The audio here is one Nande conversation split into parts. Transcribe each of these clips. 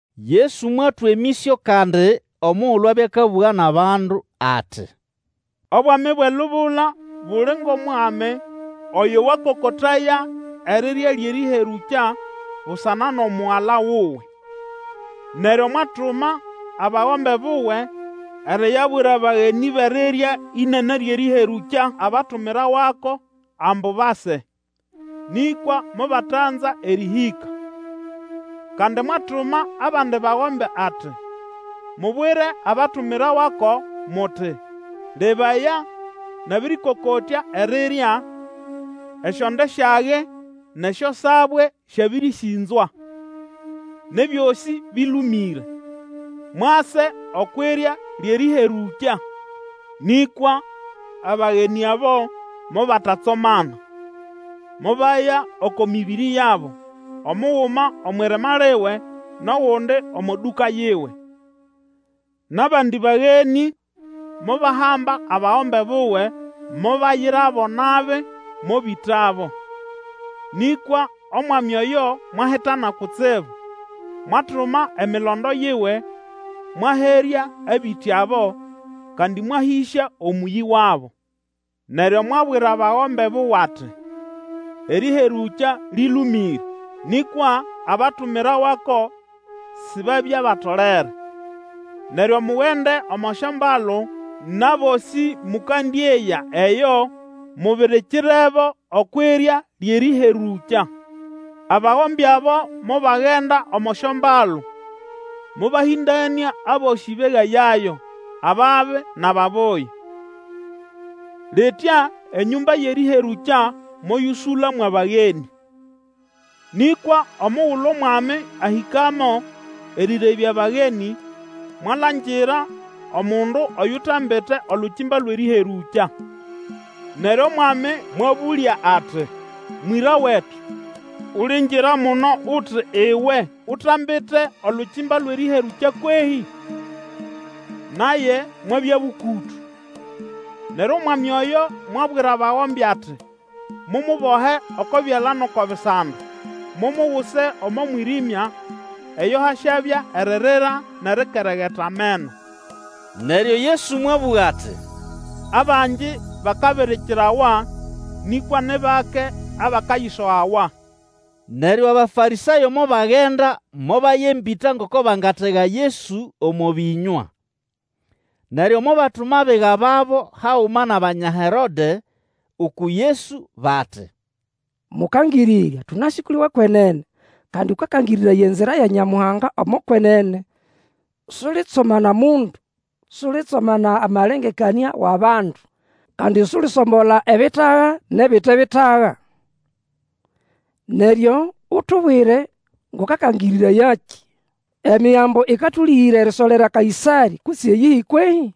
Yesu mwatwa emĩsyo kandi omugulu abya akabũga nʼabandu ati, Obwami bwʼelubula buli ngʼOmwami oyo wakokotaya erirya lyʼerĩherũkya busana nʼomugala wuwe. Neryo mwatuma abagombe buwe eriyabwira bagenĩ bʼerirya ĩnene lyʼerĩherũkya abatumirawako ambu base, nĩkwa mobatanza erĩhĩka. Kandi mwatuma abandi bagombe ati, Mubwire abatumirawako muti, Lebaya, nabĩrĩkokotya erirya; esyonde syage, nʼesyosabwe syabĩrĩsĩnzwa, nʼebyosĩ bĩlũmĩre. Mwase okwʼirya lyʼerĩherũkya! Nĩkwa abagenĩ abo mobatatsomana, mobaya oko mĩbĩrĩ yabo, omuguma omwʼirima liwe, nʼogundi omo dũka yiwe. Nʼabandi bagenĩ mobahamba abagombe buwe, mobayirabo nabi, mobĩtabo. Nĩkwa omwami oyo mwahitana kutsibu, mwatuma emilondo yiwe, mwaherya abĩtĩ abo, kandi mwahĩsya omũyĩ wabo. Neryo mwabwira bagombe buwe ati, Erĩherũkya lĩlũmĩre, nĩkwa abatumirawako sibabya batolere. Neryo mugende omo syombalu, nʼabosĩ mũkandĩeya eyo, mubirikirebo okwʼirya lyʼerĩherũkya. Abagombe abo mobagenda omo syombalu mobahĩndanĩa abosĩ begayayo, ababi nʼababuya. Litya enyũmba yʼerĩherũkya moyũsũla mwʼabagenĩ. Nĩkwa omugulu omwami ahĩkamo erĩrebya abagenĩ, mwalangira omundu oyutambite olukimba lwʼerĩherũkya. Neryo omwami mwabũlya ati, Mwĩra wetu, ulingira muno uti iwe utambite olukimba lwʼerĩherũkya kwehĩ? Naye mwabya bũkũtũ. Neryo omwami oyo mwabwira bagombe ati, Mumubohe oko byala nʼoko bisando, mumuguse omo mwĩrĩmya, eyo hasyabya eririra nʼerikeregeta ameno. Neryo Yesu mwabũga ati, Abangi bakabirikirawa, nĩkwa ni bake abakayisogawa. Neryo Abafarĩsayo mobagenda mobaya embĩta ngoko bangatega Yesu omo bĩnywa. Neryo mobatuma abiga babo haguma nʼAbanya Herode uku Yesu bati, Mũkangĩrĩrya, tũnasĩ kʼuli wʼekwenene, kandi Akakangĩrĩraya enzira ya Nyamuhanga omo kwenene, sulitsomana mundu, sulitsomana amalengekanĩa wʼabandu, kandi sulisombola ebitaga nʼebite bitaga. Neryo utubwire ngʼukaganĩrayakĩ. Emigambo ĩkatũlĩgĩra erisolera Kaĩsarĩ, kutse iyihi kwehĩ?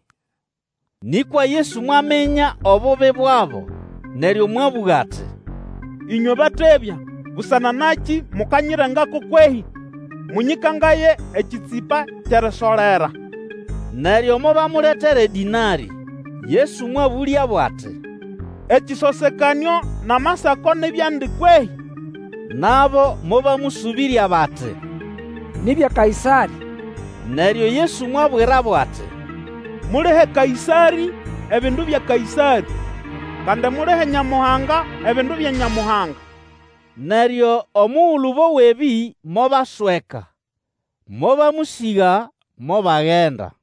Nĩkwa Yesu mwaminya obubi bwabo neryo mwabũga ati, Ĩnywe batebya! Busana nakĩ mukanyirengako kwehĩ? Mũnyĩkangaye ekĩtsĩpa kyʼerisolera. Neryo mobamuletera edĩnarĩ. Yesu mwabũlyabo ati, Ekĩsosekanĩo nʼamasako ni byandi kwehĩ? Nabo mobamũsũbĩrya bati, Ni bya Kaĩsarĩ. Neryo Yesu mwabwirabo ati, Mulihe Kaĩsarĩ ebindu bya Kaĩsarĩ, kandi mulihe Nyamuhanga ebindu bya Nyamuhanga. Neryo omugulu bowa ebĩ mobasweka, mobamũsĩga, mobagenda.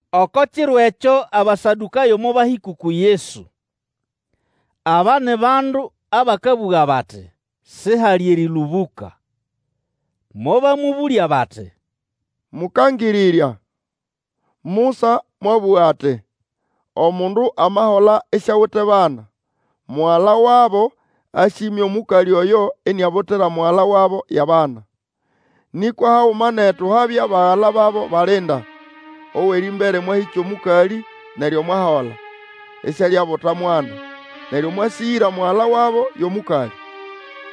Oko kiro ekyo Abasadũkayo mobahĩka uku Yesu. Aba ni bandu abakabũga bati, sihali erĩlũbũka. Mobamũbũlya bati, Mũkangĩrĩrya, Musa mwabũga ati, Omundu amahola isiawite bana, mugala wabo asyĩmya omũkalĩ oyo iniabutira mugala wabo yʼabana. Nĩkwa haguma netu habya bagala babo balinda, owʼerĩmbere mwahĩkya omũkalĩ, neryo mwahola, isialyabuta mwana, neryo mwasĩgĩra mugala wabo yʼomũkalĩ.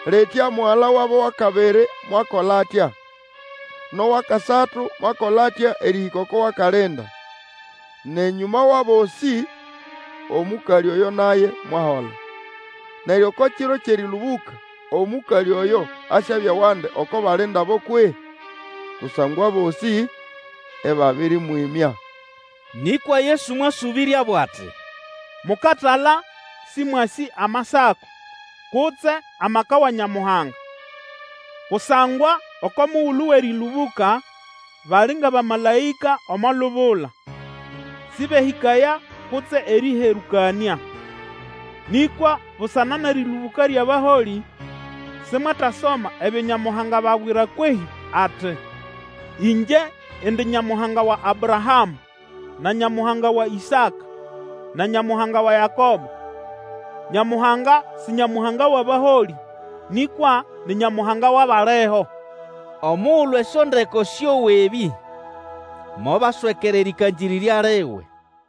Litya mugala wabo wʼakabiri mwakola atya, nʼowʼakasatu mwakola atya erĩhĩka oko wʼakalinda. Nʼenyũma wʼabosĩ omũkalĩ oyo naye mwahola. Neryo oko kiro kyʼerĩlũbũka, omũkalĩ oyo asyabya wandi oko balinda abo kwehĩ? Kusangwa abosĩ ĩbabĩrĩmwĩmya. Nĩkwa Yesu mwasũbĩryabo ati, Mukatala, sĩmwasĩ Amasako, kutse amaka wa Nyamuhanga. Kusangwa oko mugulu wʼerĩlũbũka bali ngʼabamalaĩka omo lubula. Sĩbehĩkaya kutse erĩherũkanĩa. Nĩkwa busana nʼerĩlũbũka lyʼabaholĩ simwetasoma ebyo Nyamuhanga ababwira kwehĩ ati, Ĩngye indi Nyamuhanga wa Abrahamũ, na Nyamuhanga wa Ĩsaka, na Nyamuhanga wa Yakobo. Nyamuhanga si Nyamuhanga wʼabaholĩ, nĩkwa ni Nyamuhanga wʼabaliho. Omugulu esyondeko syowa ebĩ, mobaswekera erĩkangĩrĩrya liwe.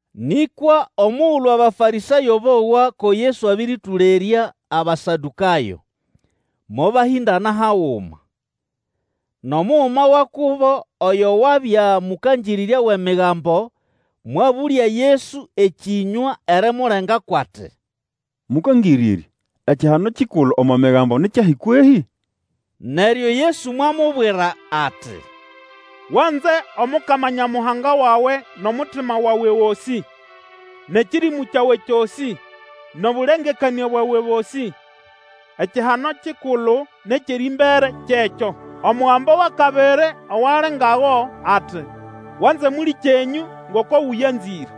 Nĩkwa omugulu Abafarĩsayo bowa ko Yesu abĩrĩtũlerya Abasadũkayo, mobahĩndana haguma. Nʼomuguma wa kubo oyo wabya mũkangĩrĩrya wʼEmigambo mwabũlya Yesu ekĩnywa erimulengako, ati, Mũkangĩrĩrya, ekihano kikulu omo Migambo ni kyahi kwehĩ? Neryo Yesu mwamubwira ati, Wanze Omukama Nyamuhanga wawe nʼomutima wawe gosĩ, nʼekĩrĩmũ kyawe kyosĩ nʼobũlengekanĩa bwawe bosĩ. Ekihano kikulu nʼekyʼerĩmbere kyekyo. Omugambo wʼakabiri owali ngago, ati, Wanze mũlĩkyenyũ ngoko ũyanzĩre.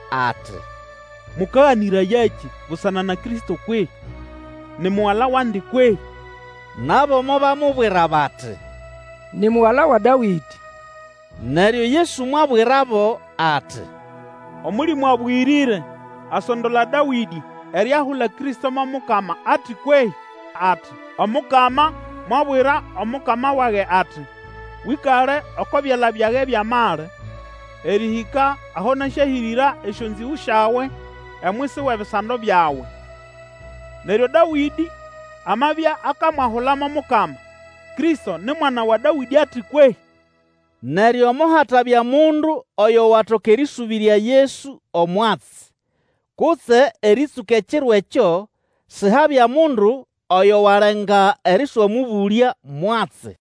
ati, Mũkaganĩrayakĩ busana na Kristo kwehĩ? Ni mugala wandi kwehĩ? Nabo mobamubwira bati, Ni mugala wa Dawĩdĩ. Neryo Yesu mwabwirabo ati, Omũlĩmũ Abũyĩrĩre asondola Dawĩdĩ eriahula Kristo mo Mukama ati kwehĩ? ati, Omukama mwabwira Omukama wage ati, Wĩkale oko byala byage byʼamali, Erĩhĩka aho nasyahĩrĩra esyonzĩgũ syawe omwisi wʼebisando byawe. Neryo Dawĩdĩ amabya akamwahula mo Mukama, Kristo ni mwana wa Dawĩdĩ ati kwehĩ? Neryo mohatabya mundu oyo watoka erĩsũbĩrya Yesu omwatsi, kutse erĩtsũka ekiro ekyo, sihabya mundu oyo walenga erĩswamũbũlya mwatsi.